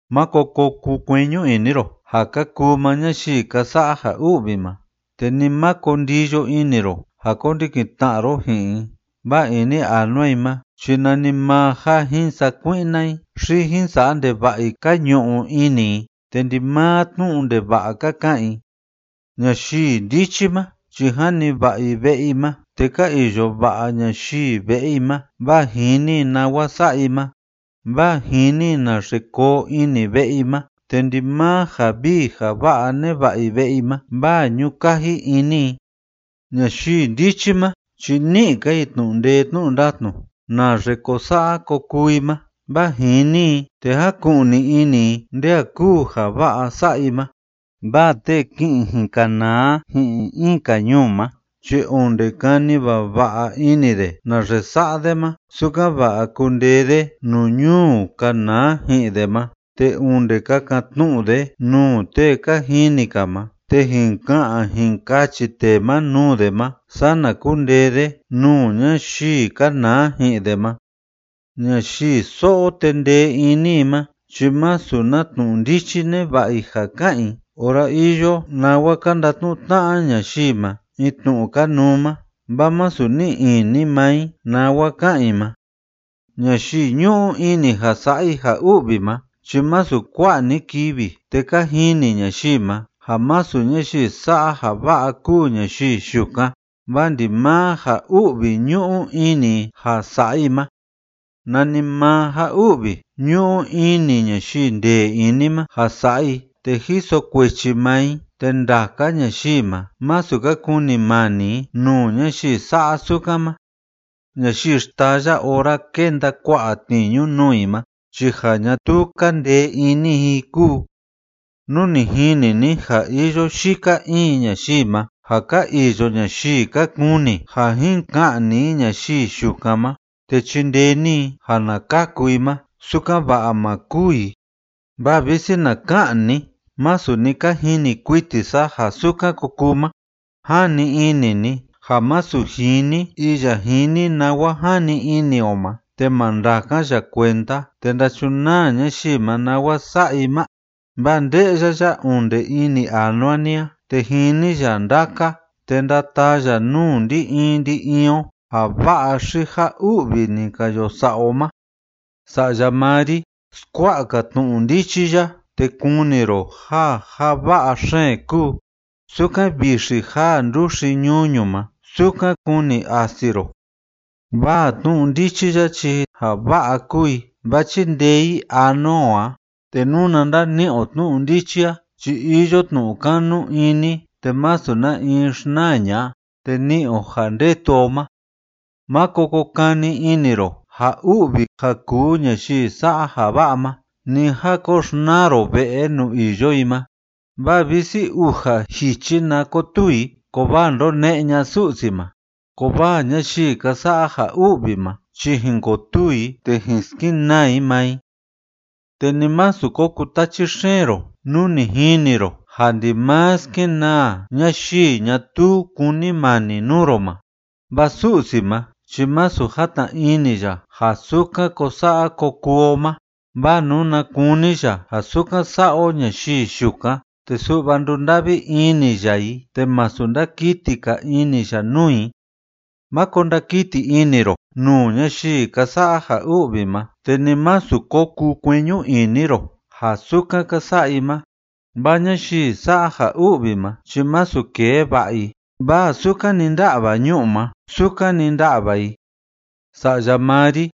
Máko ko kukueñu ini ro ja ka kuu maa ñayii ka sa'a ja u'vi ma, te ni máko ndiyo ini ro ja kondikin tna'a ro ji'in i, vaa ini anua i ma chi nanimaa ja jin sakui'na i xi jin sa'a ndeva'a i ka ñu'u ini i, te ndimaa tnu'u ndeva'a ka ka'an i. Ñayii ndichi ma chi jani va'a i ve'e i ma, te ka iyo va'a ñayii ve'e i ma, vaa jini i nawa sa'a i ma, vaa jini i naxe koo ini ve'e i ma, te ndimaa ja vii ja va'a neva'a i ve'e i ma, vaa ñu'u kaji ini i. Ñayii ndichi ma chi ni'i‑ka i tnu'u ndee tnu'u ndatnu naxe ko sa'a ko kuu i ma, vaa jini i te jáku'ni ini i nde a kúu ja va'a sa'a i ma, vaa tee ki'in jin kanaa ji'in in‑ka ñuu ma chi onde kani vava'a ini de naxe sa'a de ma, sukan‑va'a kundee de nuu ñuu kanaa ji'in de ma, te onde kakan‑tnu'u de nuu tee ka jini‑ka ma, te jin ka'an jin kachi tee ma nuu de ma, sana kundee de nuu ñayii kanaa ji'in de ma. Ñayii so'o te ndee ini i ma chi masu na tnu'u ndichi neva'a i ja ka'an i ora iyo nawa ka ndatnu'u tna'a ñayii ma in tnu'u kanuu ma, vaa masu ni'i ini maa i nawa ka'an i ma. Ñayii ñu'u ini ja sa'a i ja u'vi ma chi masu kua'a‑ni kivi te ka jini ñayii ma ja masu ñayii sa'a ja va'a kúu ñayii yukan, vaa ndimaa ja u'vi ñu'u ini i ja sa'a i ma. Nanimaa ja u'vi ñu'u ini ñayii ndee ini ma ja sa'a i te jiso kuechi maa i, te ndaka ñayii ma, masu ka kunimani i nuu ñayii sa'a sukan ma. Ñayii xtaya ora kénda kua'a tniñu nuu i ma chi ja ñatuu kaa ndee ini i kúu. Nú ni jini ni ja iyo yika in ñayii ma ja ka iyo ñayii ka kuni ja jin ka'ni i ñayii yukan ma, te chindee ni i ja na kaku i ma, sukan‑va'a ma kûu i, vaa visi na ka'an ni: “Masu ni ka jini kuiti sa ja sukan ko kuu ma”, ¿jani ini ni ja masu jini iya jini nawa jani ini o ma te ma ndakan ya kuenda te ndachunaa ñayii ma nawa sa'a i ma?, vaa nde'ya ya onde ini anua ni a, te jini ya ndaka, te ndataa ya nuu ndi‑in ndi‑in o ja va'a xi ja u'vi ni ka yo sa'a o ma. Sa'ya maa ri, skua'a‑ka tnu'u ndichi ya te kuni ro ja ja va'a xeen kúu. Sukan vixi jaa nduxi ñuñu ma, sukan kuni asi ro. Vaa tnu'u ndichi a chi ja va'a kúu i, vaa chíndee i anua o a, te nuna ndani'i o tnu'u ndichi a chi iyo tnu'u kanu ini te masu na in xnaa ña'a, te ni'i o ja ndetu o ma. Máko ko kani ini ro ja u'vi ja kúu ñayii sa'a ja va'a ma, ni a ko xnaa ro ve'e nuu iyo i ma, vaa visi uja jichi na kotuu i, kovaa ndone'e ña'a Su'si ma, kovaa ñayii ka sa'a ja u'vi ma chi jin kotuu i te jin skenaa i maa i. Te ni másu ko kutachi xeen ro nú ni jini ro ja ndimaa skenaa ñayii ñatuu kúnimani nuu ro ma, vaa Su'si ma chi masu játna ini ya ja sukan ko sa'a ko kuu o ma, vaa nuna kuni ya ja sukan sa'a o ñayii yukan te su'va ndunda'vi ini ya i te masu ndakiti‑ka ini ya nuu i. Máko ndakiti ini ro nuu ñayii ka sa'a ja u'vi ma, te ni másu ko kukueñu ini ro ja sukan ka sa'a i ma, vaa ñayii sa'a ja u'vi ma chi masu kee va'a i, vaa sukan‑ni ndá'va ñu'u ma, sukan‑ni nda'va i. Sa'ya maa ri,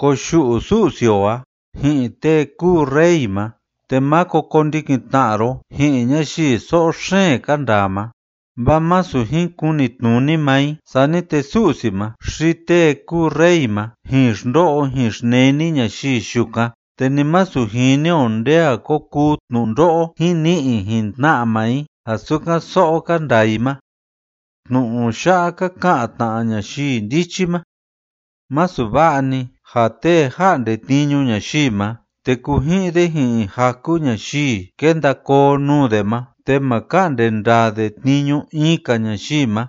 koyu'u Su'si o a ji'in tee kúu rey ma, te máko kondikin tna'a ro ji'in ñayii so'o xeen ka ndaa ma, vaa masu jin kunitnuni maa i, sani te Su'si ma xi tee kúu rey ma jin xndo'o jin xneni ñayii yukan, te ni masu jini o nde a ko kuu tnundo'o jin ni'i jin tna'a maa i ja sukan so'o ka ndaa i ma. Tnu'u ya'a ka ka'an tna ñayii ndichi ma: Masu va'a‑ni ja tee ja'nde tniñu ñayii ma, te kuji'in de ji'in jaku ñayii kenda koo nuu de ma, te ma ka'nde ndaa de tniñu in‑ka ñayii ma.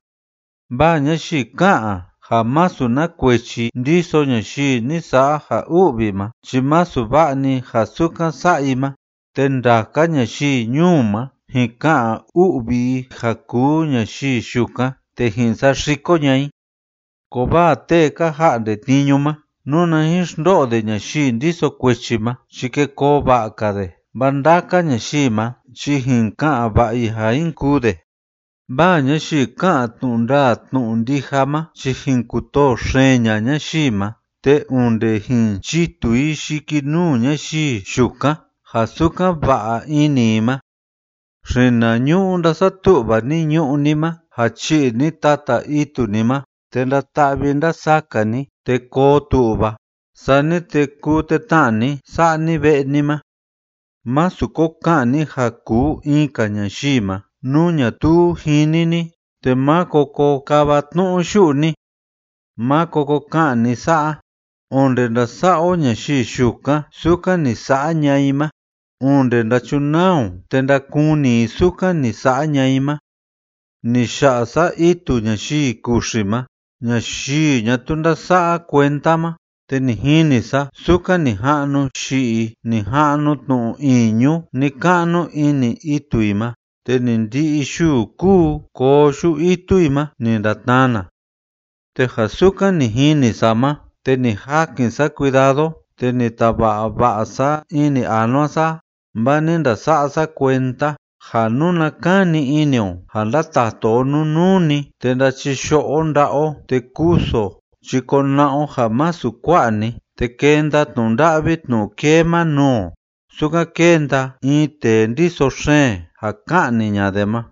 Vaa ñayii ká'an ja masu na kuechi ndiso ñayii ni sa'a ja u'vi ma chi masu va'a‑ni ja sukan sa'a i ma, te ndaka ñayii ñuu ma jin ka'an u'vi i ja kuu ñayii yukan, te jin saxiko ña'a i. Kovaa tee ka ja'nde tniñu ma, nuna jin xndo'o de ñayii ndiso kuechi ma chi ke koo va'a‑ka de, vaa ndaka ñayii ma chi jin ka'an va'a i ja jin kuu de. Vaa ñayii ká'an tnu'u ndaa tnu'u ndija ma chi jin kutoo xeen ña'a ñayii ma, te onde jin chitu i yikinuu ñayii yukan ja sukan va'a ini i ma. Xinañu'u ndásatu'va ni ñu'ú ni ma ja chi'i ni tata itu ni ma, te ndata'vi ndasaka ni te koo tu'va, sani te kuu tetna'a ni sa'a ni ve'e ni ma. Másu ko ka'an ni ja kuu in‑ka ñayii ma, nú ñatuu jini ni, te máko ko kava tnu'u yu'u ni. Máko ko ka'an ni sa'a: “Onde ndasa'a o ñayii yukan sukan ni sa'a ña'a i ma, onde ndachunaa o te ndakuni i sukan ni sa'a ña'a i ma.” Ni ya'a sa itu ñayii kuxi ma ñayii ñatuu ndása'a kuenda ma, te ni jini sa sukan ni ja'nu yi'i, ni ja'nu tnu‑iñu ni‑ka'nu ini itu i ma, te ni ndi'i yuu kúu koo yu'u itu i ma ni ndatnana. Te ja sukan ni jini sa ma, te ni jakin sa cuidado te ni tava'a va'a sa ini anua sa a, vaa ni ndasa'a sa kuenda, ja nuna kani ini o ja ndatatu o nunuu‑ni, te ndachiyo'o o nda'a o te kusu o, chi kona'a o ja masu kua'a‑ni, te kenda tnu'u nda'vi tnu'u kee ma nuu o sukan kénda in tee ndiso xeen ja ka'ni ña'a de ma.